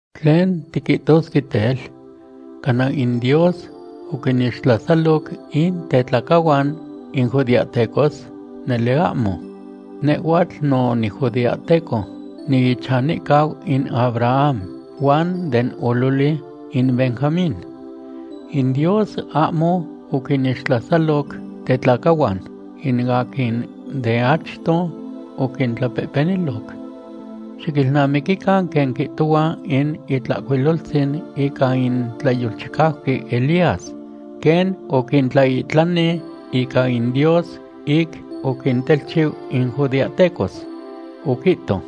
¿Tlen tiquihtosque tel? ¿Cana in Dios oquinixtlasaloc in tetlacahuan in judeahtecos? Nele ahmo. Nehhuatl no nijudeahteco, niichanicau in Abraham, huan den ololi in Benjamín. In Dios ahmo oquinixtlasaloc tetlacahuan, in aquin de achto oquintlapehpeniloc. Xiquilnamiquican quen quihtohua in Itlahcuiloltzin ica in tlayolchicauqui Elías, quen oquintlaihtlani ica in Dios ic oquintelchiu in judeahtecos. Oquihto: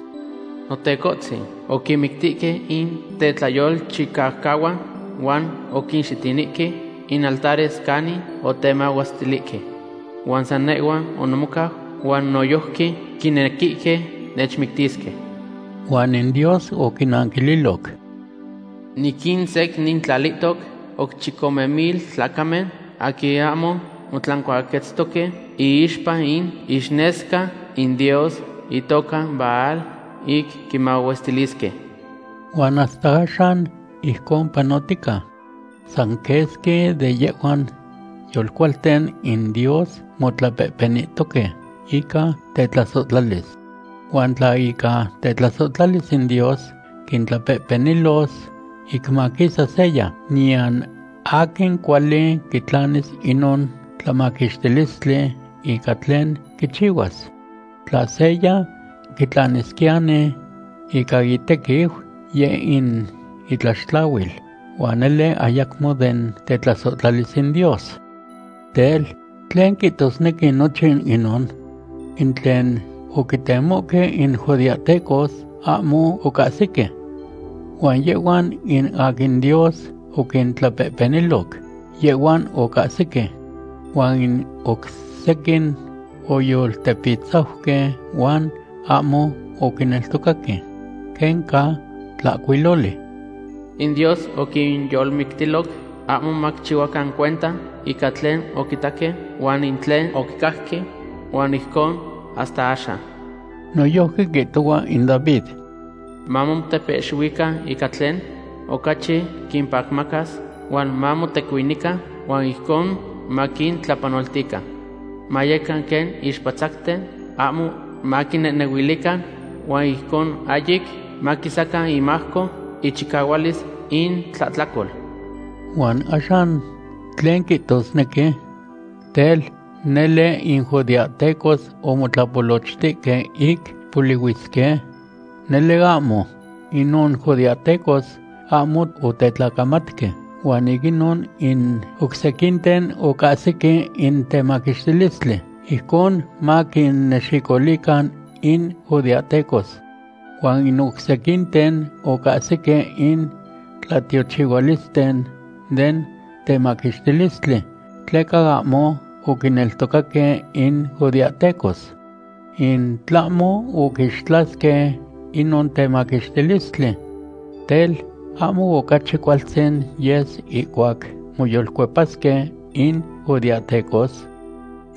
“Notecohtzin, oquinmictihque in tetlayolchicaucahuan huan oquinxitinihque in altares canin otemahuestilihque. Huan san nehhua onimocau, huan noyojqui quinequihque nechmictisque.” Huan in Dios oquinanquililoc: “Niquinsecnintlalihtoc oc chicome mil tlacamen aquin ahmo motlancuaquetztoque iixpa in ixnesca in dios itoca Baal ic quimahuestilisque.” Huan hasta axan ijcon panotica. San quesqui de yehhuan yolcualten in Dios motlapehpenihtoque ica tetlasohtlalis. Huan tla ica tetlasohtlalis in Dios quitlapehpenilos ic maquisas seya, niyan aquin cuali quitlanis inon tlamaquixtilistli ica tlen quichihuas. Tla seya quitlanisquiyani ica itequiu, yeh in itlaxtlahuil, huan nele ayacmo den tetlasohtlalis in Dios. Tel, ¿tlen quihtosnequi nochin inon? In tlen oquitemohque in judeahtecos, ahmo ocahsihque. Huan yehhuan in aquin Dios oquintlapehpeniloc, yehhuan ocahsihque. Huan in oc sequin oyoltepitzauque huan ahmo oquineltocaque. Quen ca tlahcuiloli: “In Dios oquinyolmictiloc ahmo maquichihuacan cuenta ica tlen oquitaque huan in tlen oquicajque, huan ijcon hasta axan.” Noyojqui quihtohua in David: Mamotepehxihuican ica tlen ocachi quimpacmacas, huan mamotecuinican, huan ijcon maquintlapanoltican. Mayecan quen ixpatzacten, ahmo maquinehnehuilican, huan ijcon ahyic maquisacan imajco ichicahualis intlahtlacol. Huan axan, ¿tlen quihtosnequi? Tel, ¿nele in judeahtecos omotlapolochtihque ic polihuisque? ¡Nele ahmo! Inon judeahtecos ahmo otetlacamatque, huan ic inon in oc sequinten ocahsihque in temaquixtilistli, ijcon maquinnexicoluican in judeahtecos. Huan in oc sequinten ocahsihque in tlatiochihualisten den temaquixtilistli, tleca ahmo oquineltocaque in judeahtecos, in tlahmo oquixtlasque inon temaquixtilistli. Tel, ¿ahmo ocachi cualtzin yes ihcuac moyolcuepasque in judeahtecos?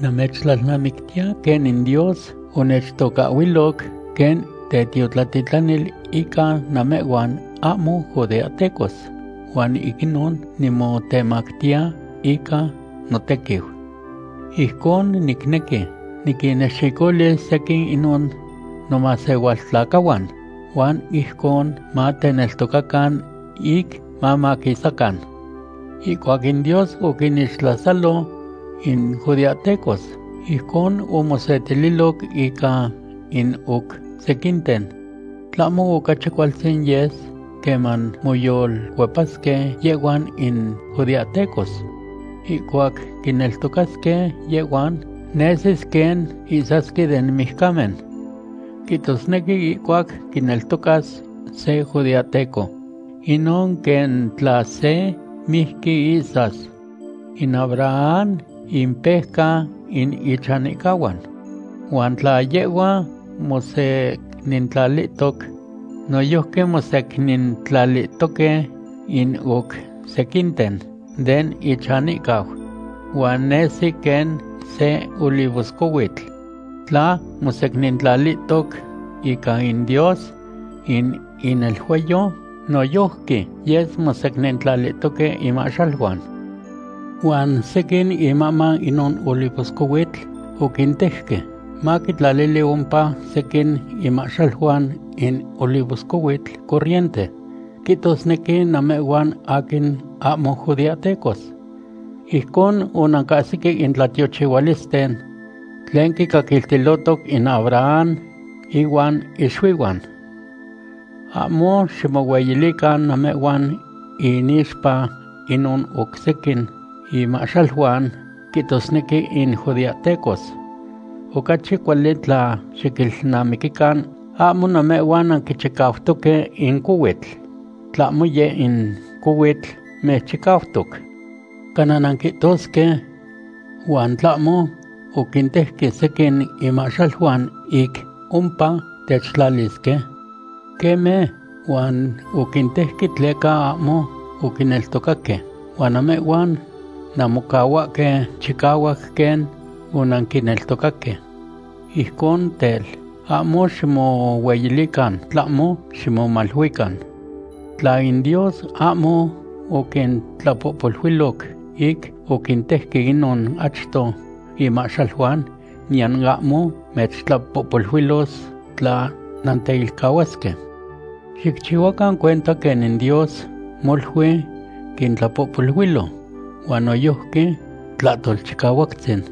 Namechtlalnamictiya quen in Dios onechtocahhuiloc quen tetiotlatitlanil ica namehhuan ahmo judeahtecos, huan ic inon nimotemachiya ica notequiu. Ijcon nicnequi niquinnexicoluis sequin inon nomasehualtlacahuan huan ijcon mateneltocacan ic mamaquisacan. Ihcuac in Dios oquinixtlasalo in judeahtecos, ijcon omosetililoc ica in oc sequinten. Tlahmo ocachi cualtzin yes queman moyolcuepasque yehhuan in judeahtecos. Ihcuac quineltocasque yehhuan, nesis quen ihsasque den mijcamen. Quihtosnequi ihcuac quineltocas se judeahteco, inon quen tla se mijqui ihsas. In Abraham impejca in ichanihcahuan. Huan tla yehhua mosecnintlalihtoc, noyojqui mosecnintlalihtoque in oc sequinten den ichanihcau. Huan nesi quen se olivoscohuitl. Tla mosecnintlalihtoc ica in Dios in ineluayo, noyojqui yes secnintlalihtoque inmahxaluan. Huan sequin imahman inon olivoscohuitl oquintejque, maquitlali ompa sequin inmahxaluan in olivoscohuitl corriente, quihtosnequi namehhuan aquin ahmo judeahtecos. Ijcon onancahsihque in tlatiochihualisten tlen quicaquiltilohtoc in Abraham ihuan ixuihuan. Ahmo ximohueyilican namehhuan inixpa inon oc sequin inmahxaluan, quihtosnequi in judeahtecos. Ocachi cuali tla xiquilnamiquican ahmo namehhuan nanquichicautoque in cohuitl, tlahmo yeh in cohuitl mechchicautoc. Cana nanquihtosque: “¿Huan tlahmo oquintejque sequin inmahxaluan ic ompa techtlalisque?” Queme, huan oquintejque tleca ahmo oquineltocaque, huan namehhuan nanmocahuahque chicahuac quen onanquineltocaque. Ijcon tel, ahmo ximohueyilican, tlahmo ximomaluican. Tla in Dios ahmo oquintlapohpoluiloc ic oquintejque inon achto inmahxaluan, niyan ahmo mechtlapohpoluilos tla nanteilcahuasque. Xicchihuacan cuenta quen in Dios molui quintlapohpoluilo, huan noyojqui Tlahtolchicahuactzin.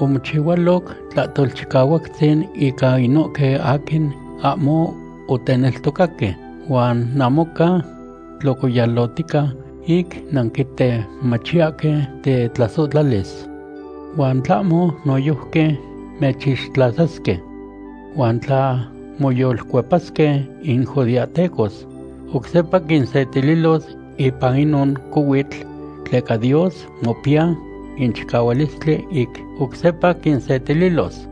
Omochihualoc Tlahtolchicahuactzin ica inohque aquin ahmo oteneltocaque, huan namoca tlocoyalotica ic nanquitemachiyahque tetlasohtlalis. Huan tlahmo noyojqui mechixtlasasque. Huan tla moyolcuepasque in judeahtecos, oc sepa quinsetililos ipan inon cohuitl, tleca Dios mopiya in chicahualistli ic oc sepa quinsetililos.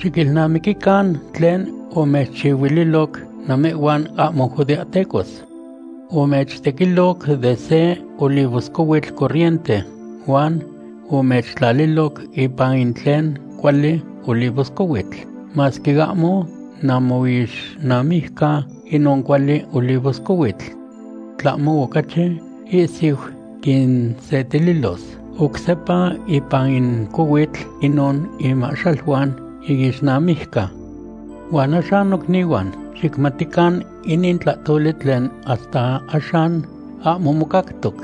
Xiquilnamiquican tlen omechchihuililoc namehhuan ahmo judeahtecos. Omechtequiloc de se olivoscohuitl corriente huan omechtlaliloc ipan in tlen cuali olivoscohuitl, masque ahmo namoixnamijca inon cuali olivoscohuitl. Tlahmo ocachi ihsiu quinsetililos oc sepa ipan in cohuitl inon inmahxaluan iixnamijca. Huan axan nocnihuan, xicmatican inin tlahtoli tlen hasta axan ahmo mocactoc,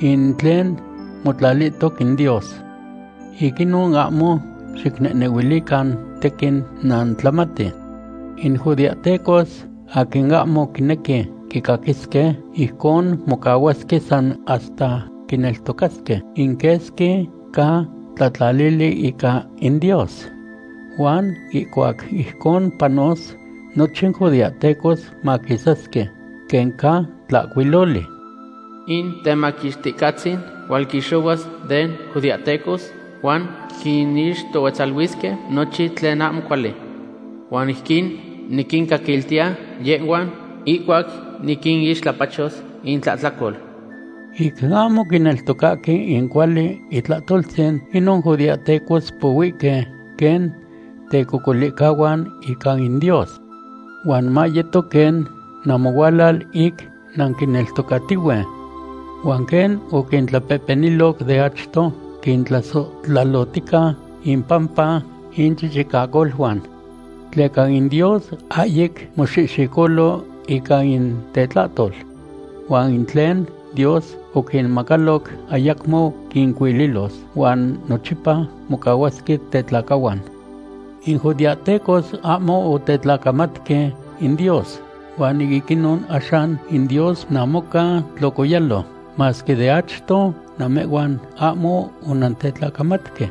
in tlen motlalihtoc in Dios. Ic inon ahmo xicnehnehuilican tequin nantlamati. In judeahtecos aquin ahmo quinequi quicaquisque, ijcon mocahuasque san hasta quineltocasque in quesqui ca tlahtlalili ica in Dios. Huan ihcuac ijcon panos, nochin judeahtecos maquisasque, quen ca tlahcuiloli: In Temaquixticahtzin hualquixohuas den judeahtecos, huan quinixtohuetzaluisque nochin tlen ahmo cuali. Huan ijquin niquincaquiltiya yehhuan, ihcuac niquinixtlapachos intlahtlacol. Ic ahmo quineltocahque in cuali itlahtoltzin, inon judeahtecos pohuihque quen tecocolihcahuan ica in Dios. Huan mayeto quen namohualal ic nanquineltocatihue. Huan quen oquintlapehpeniloc de achto, quintlasohtlalohtica impampa inchichicacoluan. Tleca in Dios ahyic moxihxicolo ica in tetlahtol. Huan in tlen Dios oquinmacaloc ayacmo quincuililos, huan nochipa mocahuasque tetlacahuan. In judeahtecos ahmo otetlacamatque in Dios huan ic inon axan in Dios namoca tlocoyalo, masque de achto namehhuan ahmo onantetlacamatque.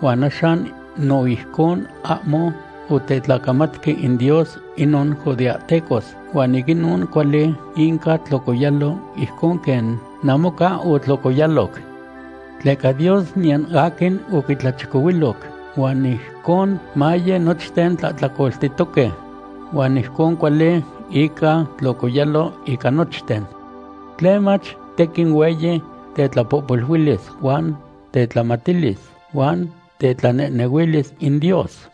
Huan axan no ijcon ahmo otetlacamatque in Dios inon judeahtecos, huan ic inon cuali inca tlocoyalo ijcon quen namoca otlocoyaloc. Tleca Dios niyan aquin oquitlachicohuiloc, huan ijcon maye nochten tlahtlacoltihtoque, huan ijcon cuali inca tlocoyalo ica nochten. ¡Tlemach tequin hueyi tetlapohpoluilis huan tetlamatilis huan tetlanehnehuilis in Dios!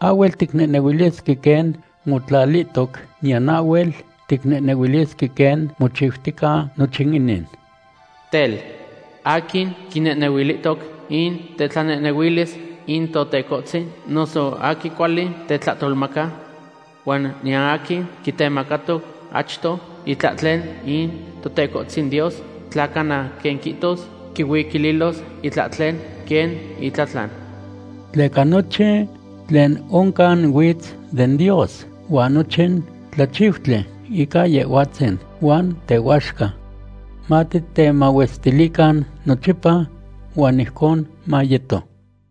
Ahhuel ticnehnehuilisque quen motlalihtoc, niyan ahhuel ticnehnehuilisque quen mochiutica nochin inin. Tel, ¿aquin quinehnehuilihtoc in tetlanehnehuilis in Totecohtzin, noso aquin cuali tetlahtolmaca? Huan niyan aquin quitemacato achto itlahtlen in Totecohtzin Dios, tla cana quen quihtos quihuiquililos itlahtlen quen itlatlan. Tleca nochin tlen oncan huitz den Dios, huan nochin tlachiutli ica Yehhuatzin huan tehuaxca. Matitemahuestilican nochipa. Huan ijcon mayeto.